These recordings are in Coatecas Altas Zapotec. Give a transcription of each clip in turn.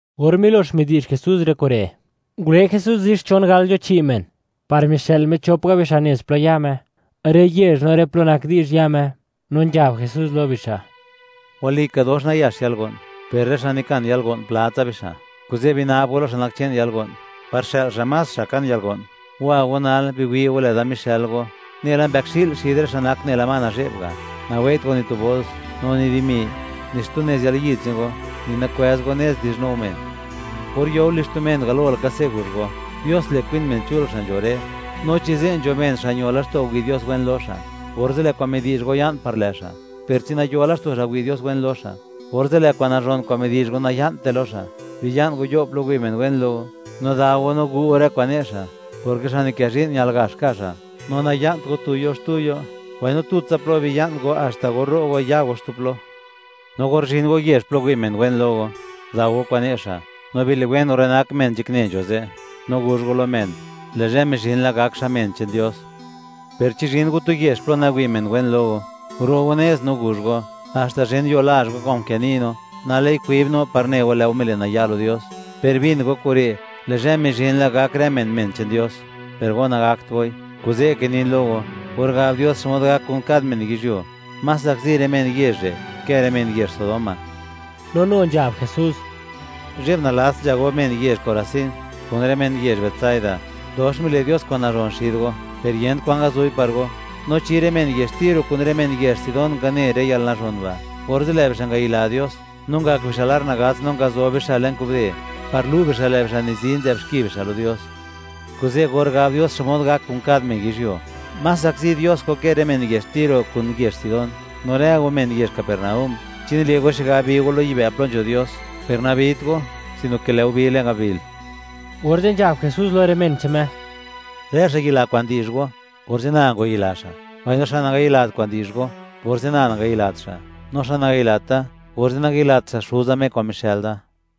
Or milox midi'zh Jesús rë kure', ngule Jesús zi xchon gal nzho chi' men par mixë'l Me chop ga' bixa' nez plo ya Me, rë yezh no rë plo nak di'zh ya Me, no nzhab Jesús lo bixa': ―Walika, dox nayax yalgo'n, per rë xa' nikan yalgo'n, pla tsa bixa'; kuze' bina'b go lo xa' nak che'n yalgo'n par xë'l xa' más xa' kan yalgo'n. Wa go nal, biwi' go lë'da mixël go, nela mbëkxi'l xid rë xa' nak nela ma nazhe'b ga'. Nawei't go ni tu bols, no ni dimi, ni xtu nez yalyid che'n go; no ni nakwëz go nez, di'zhnu go men. Or yo go lizh tu men, galo laka se' guzh go: “Dios le', kwin men chul xa' nzho re'.” No chi ze' nzho men, xa' ño laxto' wi' Dios wen lo xa', orze' lë' kwan midi'zh go ya'n par lë' xa'; per chi nayo laxto' xa', wi' Dios wen lo xa', orze' lë' kwa'n nazhon kwa'n midi'zh go, naya'nte lo xa'. Biya'n go yo' plo wi' men wen lo go, no dao go no gu' go rë kwa'n ne' xa', porke xa' nikë zhi'n, ñal gax ka' xa'; no naya'nt go tu yo' xtu yo', mbaino tutsa plo biya'n go haxta or ro' go, ya go xtu plo. No or zhin go yezh plo wi' men wen lo go, dao go kwa'n ne' xa', no biliwen go rë nak men nzhakne nzho ze', no guzh go lo men, le' zhë mizhin la, gak xa' men che'n Dios. Per chi zhin go tu yezh plo nawi' men wen lo go, guro' go nez, no guzh go: “Haxta zhen yuo lazh go, kwa'n nkë ni' no, nal lë'i kwib no par ne go, lë' go mile' naya' lo Dios; per bin go kure', lë' zhë mizhin la gak rë men, men che'n Dios, per go nagakt goi.” Kuze' kinin lo go, or gab Dios xmod gak kun kad men yizhyuo, más zakzi rë men yezh re', ke rë men yezh Sodoma. No nu nzhab Jesús: ―¡Zhe'b nalats nzha go, men yezh Corazín, kun rë men yezh Betsaida! Dox mile' Dios kwa'n nazhon xid go, ¡per yent kwan ngazu'i par go! No chi rë men yezh Tiro kun rë men yezh Sidón ngane rë yalnazhon ba', orze' lë' bixa' ngayila Dios, no ngak bixa' lar nagats, no ngazob bixa' le'n kubde, par lu' bixa', lë' bixa' nizi, nzë'b xki bixa' lo Dios. Kuze', or gab Dios xmod gak kun kad men yizhyuo, más zakzi Dios go, ke rë men yezh Tiro kun yezh Sidón. No rë go, men yezh Capernaúm, ¿chi nile' go xigab, bi go lo yibë' plo nzho Dios? Per nabit go, sino ke, ¡lë' go bi le'n gabil! Orze' nzhab Jesús lo rë men che'n Me: ―Rë xa' yila kwa'n di'zh go, orze' na ngwayila xa'; mbaino xa' nangayilat kwa'n di'zh go, orze' na nangayilat xa'; no xa' nangayilat da, orze' nangayilat xa' Xuza, Me kwa'n mixë'l da.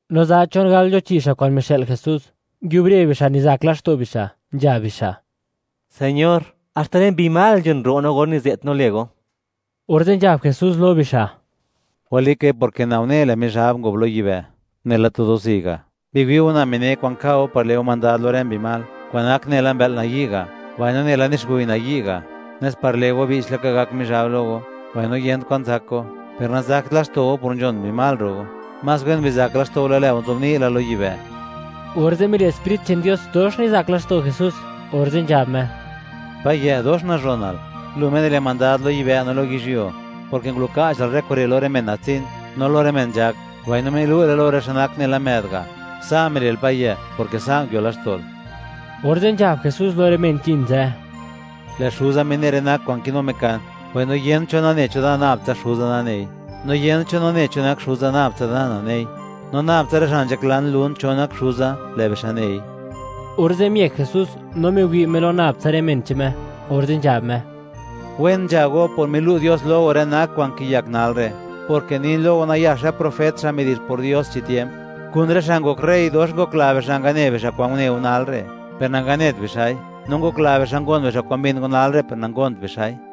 No za chon gal nzho chi' xa' kwa'n mixë'l Jesús, nguiubre bixa', nizak laxto' bixa', nzhab bixa': ―Señor, haxta rë mbi mal nzhon ro' no, or nize't no lë go. Orze' nzhab Jesús lo bixa': ―Walikai, porke na une lë' Mizhab ngob lo yibë', nela tu do'zi' ga'. Biwi' go, na mine' kwa'n ka' go par le' go mandad lo rë mbi mal, kwa'n nak nela mbë'l nayi' ga' mbaino nela nixguy nayi' ga', nes par le' go, che'ptsa (bi'ch laka) gak Mizhab lo go, mbaino yent kwa'n zak go. Per nazakt laxto' go por nzhon mbi mal ro' go; más wen bizak laxto' go, lë' lë go nzobni' la lo yibë'. Orze' mile' Sprit che'n Dios, dox nizak laxto' Jesús, orze' nzhab Me: ―Payë', dox nazhonal, Lu Me nile' mandad lo yibë' no lo yizhyuo, porke nguluka'chal rë kure' lo rë men natsin, no lo rë men nzhak; mbaino milu'le lo rë xa' nak nela më'd ga'. Sa' mile'l Payë', porke sa' nguio laxto'l. Orze' nzhab Jesús lo rë men nzhin ze': —Lë' Xuza mine' rë nak kwa'n kinu Me kan. Mbaino yent cho nane cho Da, nab tsa Xuza nanei. No yent cho nane cho nak Xuza, nab tsa Da nanei, no nab tsa rë xa' nzhaklan lun, cho nak Xuza, lë' bixa' nei. Orze' miëk Jesús, no miwi' Me lo nab tsa rë men che'n Me, orze' nzhab Me: ―Wen nzha go, por milu' Dios lo go, rë nak kwa'n kiyak nal re', porke nin lo go, nayax rë profet, xa' midi'zh por Dios chi tiemp, kun rë xa' ngok rey; dox ngokla bixa' ngane bixa' kwa'n une go nal re', per nanganet bixa'i; no ngokla bixa' ngon bixa', kwa'n mbin go nal re', per nangont bixa'i.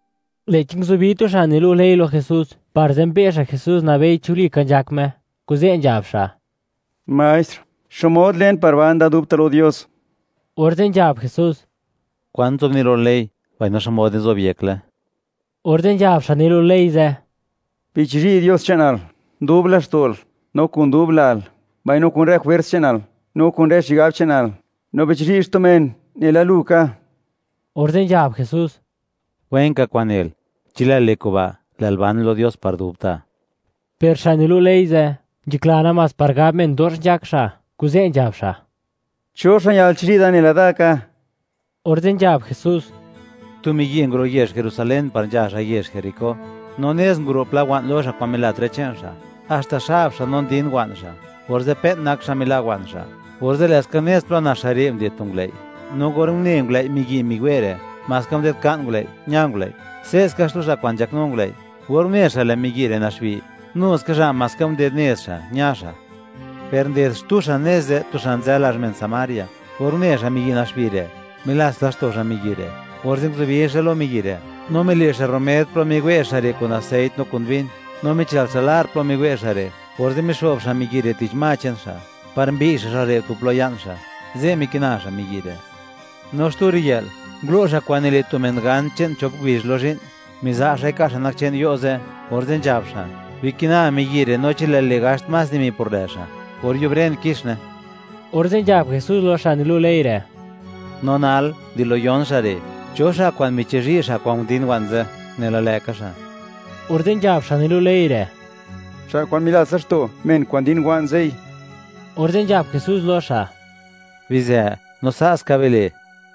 Lë'chi nguzubi tu xa' nilu' ley lo Jesús, par zenbe' xa' Jesús (wi' xa' xmod nak Jesús), nabei chi walika nzhak Me, kuze' nzhab xa': ―Maestr, ¿xmod len par ban da dubta' lo Dios? Orze' nzhab Jesús: ―¿Kwan nzobni' lo ley, mbaino xmod nizobyekle? Orze' nzhab xa' nilu' ley ze': ―“Bichizhi' Dios che'nal, dub laxto'l, no kun dub lal, mbaino kun rë jwers che'nal, no kun rë xigab che'nal. No bichizhi' xtu men nela lu ka.” Orze' nzhab Jesús: ―Wenka kwa'n nel; chi lë'l le' kuba', lë'l ban lo Dios par dubta'. Per xa' nilu' ley ze', nzhakla namás par gab men, dox nzhak xa', kuze' nzhab xa': ―¿Cho xa' ñal chizhi' da, nela da ka? Orze' nzhab Jesús: ―Tu miyi' nguro' yezh Jerusalén par nzha xa' yezh Jericó, no nez nguro' pla wa'n lo xa', kwa'n milat rë che'n xa', haxta xab xa'; no ndin wa'n xa', orze' pe'n nak xa' mila' wa'n xa'. Orze', lë'ska nez plo nax xa' re', nded tu ngulëi', no or une ngulëi' miyi' miwe' re', maska nded nka'n ngulëi', ña ngulëi'. Se'ska xtu xa' kwa'n nzhaknu ngulëi', or une xa', lë' miyi' re' naxbi, nu ska xa' maska nded nez xa', ña xa'. Per nded xtu xa' nez ze', tu xa' nzë lazh men Samaria. Or une xa', miyi' naxbi re', milats laxto' xa' miyi' re', orze' nguzubi xa' lo miyi' re', no mile' xa' rumed plo miwe' xa' re' kun aseit no kun bin; no michël xa' lar plo miwe' xa' re', orze' mixo'b xa' miyi' re', tich ma che'n xa', par mbiy' xa' xa' re' tu plo ya'n xa'; ze' mikina xa' miyi' re'. No xtu riyë'l, ngulo' xa' kwa'n nile' tu men gan, che'n chop ngubizh lo zhi'n, miza' xa'i ka' xa' nak che'n yo' ze', orze' nzhab xa': “Bikina miyi' re', no chi lë'l le' gaxt más dimi por lë' xa', or yubren, kixne.” Orze' nzhab Jesús lo xa' nilu' ley re': ―No nal, di lo yon xa' re', ¿cho xa' kwa'n michizhi' xa' kwa'n undin wa'n ze', nela lë'ka xa'? Orze' nzhab xa' nilu' ley re': ―Xa' kwa'n milats laxto' men kwa'n ndin wa'n ze'i. Orze' nzhab Jesús lo xa': ―Bizë, no sa' ska bile'.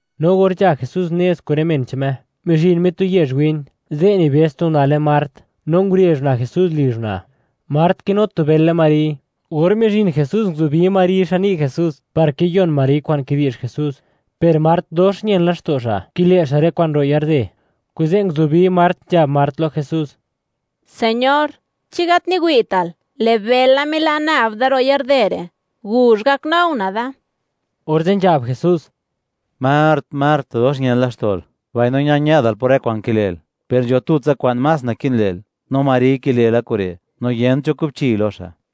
No or nzha Jesús nez kun rë men che'n Me, mizhin Me tu yezh win, ze' nibëz tu una' lë Mart, no ngurezh una' Jesús lizh una'. Mart kinu tu bël lë Mari. Or mizhin Jesús, nguzubi Mari xan ni' Jesús par kiyon Mari kwa'n kidi'zh Jesús, per Mart dox ñen laxto' xa', kile' xa' rë kwa'n ro' yarde, kuze' nguzubi Mart, nzhab Mart lo Jesús: ―Señor, ¿chi gat niwi'tal?, lë' bëla mila' nab da ro' yarde re'. ¡Guzh, gaknu una' da! Orze' nzhab Jesús: ―¡Mart, Mart, dox ñen laxto'l, mbaino ña-ñë'dal por rë kwa'n kile'l! Per nzho tutsa kwa'n más naki'n le'l, no Mari kile' la kure', no yent cho kubchiy lo xa'.